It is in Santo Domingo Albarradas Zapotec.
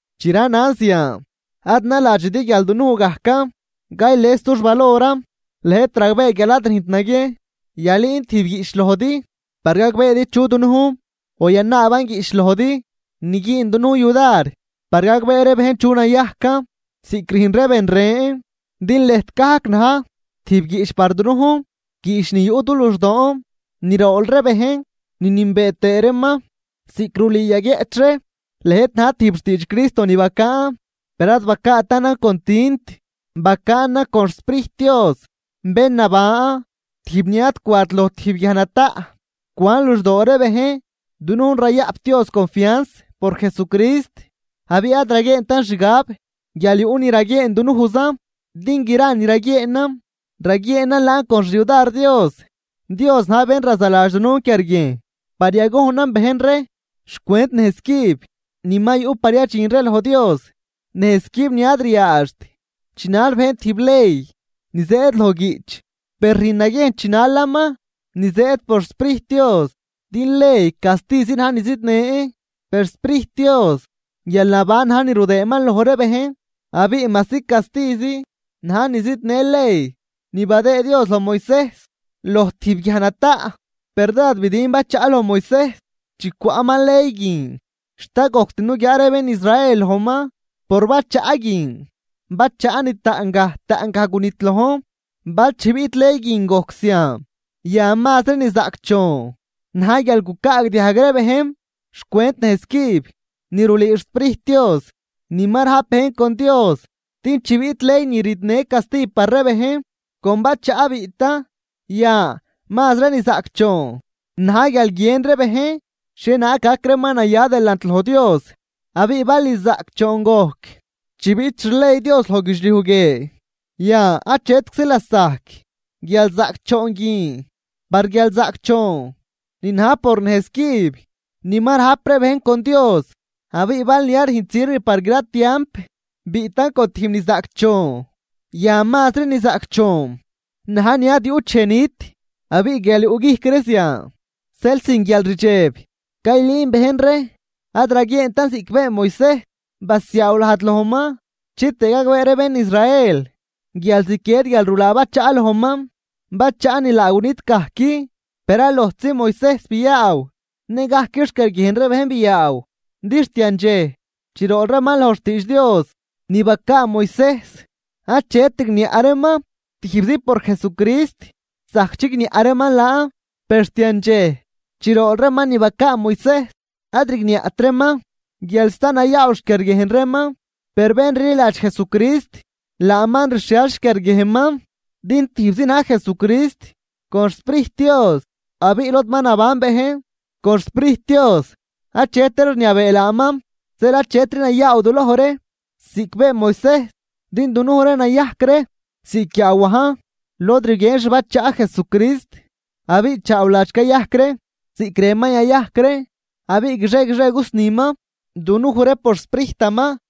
Chi ranan zian, ad naladxidi guial dunuj gajcan cayles dux valoran. Lëjt ragbee guial ad rüjnt naguiejn yalüün tijb guiꞌch lojdi par gagbeedi chu dunujn o yanaaban guiꞌch lojdi ni güün dunujn yudar par gagbee ree bejn chu nayajcan ziꞌc rüjn ree ben ren. Din lëjt gajc na̱j tijb guiꞌch par dunujn, guiꞌch ni yuꞌ du luxdoon ni rool ree bejn ni nünbee tëë reeman. Ziꞌc rulüü yaguieꞌch ree lëjt na̱j tijb xtiidx Cristo ni bacaan, per ad bacaatanan con tint, bacaanan con xSprijt Dios bén naban, tijb ni ad cwat loj tijb guiaj nataꞌ, cwan luxdoo ree bejn. Dunujn rayaꞌp Dios confianz por Jesucrist, abiꞌ ad raguieentan xgab guial yuꞌ ni raguieen dunujzan, din gra ni raguieenan, raguieenan laan con xyudar Dios. Dios na̱j bén razaladx dunujn quiarguiejn par yagojnan bejn ree xcwent nejz cüb ni ma yuꞌ par yadxin ree loj Dios, nejz cüb ni ad ryaadxt chinal bejn tijb ley ni zëëd loj guiꞌch, per rüjn naguiejn chinalaman ni zëëd por xSprijt Dios. Din ley castizi na̱j ni zidnën, per xSprijt Dios guialnaban na̱j ni rudëëman loj ree bejn. Abiꞌ majsi castizi na̱j ni zidnë ley ni badëë Dios loj Moisejs loj tijb guiaj nataꞌ, per dád bidiin bachaꞌ loj Moisejs chi cwaꞌman ley guin, xt ad gojct nuguiaa ree bén Israel lojman por bachaꞌ guin, bachaꞌ ni taꞌngaj taꞌngaj gunidlojn. Bal chi biꞌt ley guin gojc zian, yan, ¡mazri ni zaꞌcdxoon na̱j guial gucaagdiajg ree bejn xcwent nejz cüb ni rulüü xSprijt Dios ni ma rajp bejn con Dios! Din chi biꞌt ley ni ridnë casti par ree bejn, con bachaꞌ biꞌtan, yan, ¡mazri ni zaꞌcdxoon na̱j guial guien ree bejn xhienaag gac reeman naya delant loj Dios! Abiꞌ bal ni zaꞌcdxoon gojc chi biꞌt xley Dios loj guidxliuj guie, yan achetczi lasajc guialzaꞌcdxoon guin par guialzaꞌcdxoon ni na̱j por nejz cüb ni ma rajp ree bejn con Dios. Abiꞌ bal ni ad rüjnt sirv par gra tiamp, biꞌtan con tijb ni zaꞌcdxoon, yan mazri ni zaꞌcdxoon na̱j ni ad yuꞌt dxej nit. Abiꞌ guial yuꞌguijc ree zian, zeel sin guialrdxeb caylüünan bejn ree. Ad raguieentan ziꞌc been Moisejs, basiaaw lajd lojman chitëë gagbee ree bén Israel guial ziquied guialrulaa bachaꞌ lojman, bachaꞌ ni laa gunit gajc. Per ad lojtzi Moisejs biaaw, ne gajc xquiarguiejn ree bejn biaaw. Din xt yandxej chi rool reeman loj xtiidx Dios ni bacaa Moisejs, achet rigniaꞌ reeman, tijbzi por Jesucrist zajc chigniaꞌ reeman laan. Per xt yandxej chi rool reeman ni bacaa Moisejs ad rigniaꞌt reeman guial sta nayaaw xquiarguiejn reeman. Per bén rliladx Jesucrist, laaman rxhial xquiarguiejnman. Din tijbzi na̱j Jesucrist con xSprijt Dios, abiꞌ lod ma naban bejn con xSprijt Dios achetri rniabee laaman. Zeel achetri nayaaw duloj ree ziꞌc been Moisejs, din dunuj ree nayajc ree ziꞌc guiaawajn lod rguien xbachaꞌ Jesucrist abiꞌ chaawladx cayajc ree ziꞌc rënman yayajc ree, abiꞌ guixie guixie cusniman dunuj ree por xSprijtaman.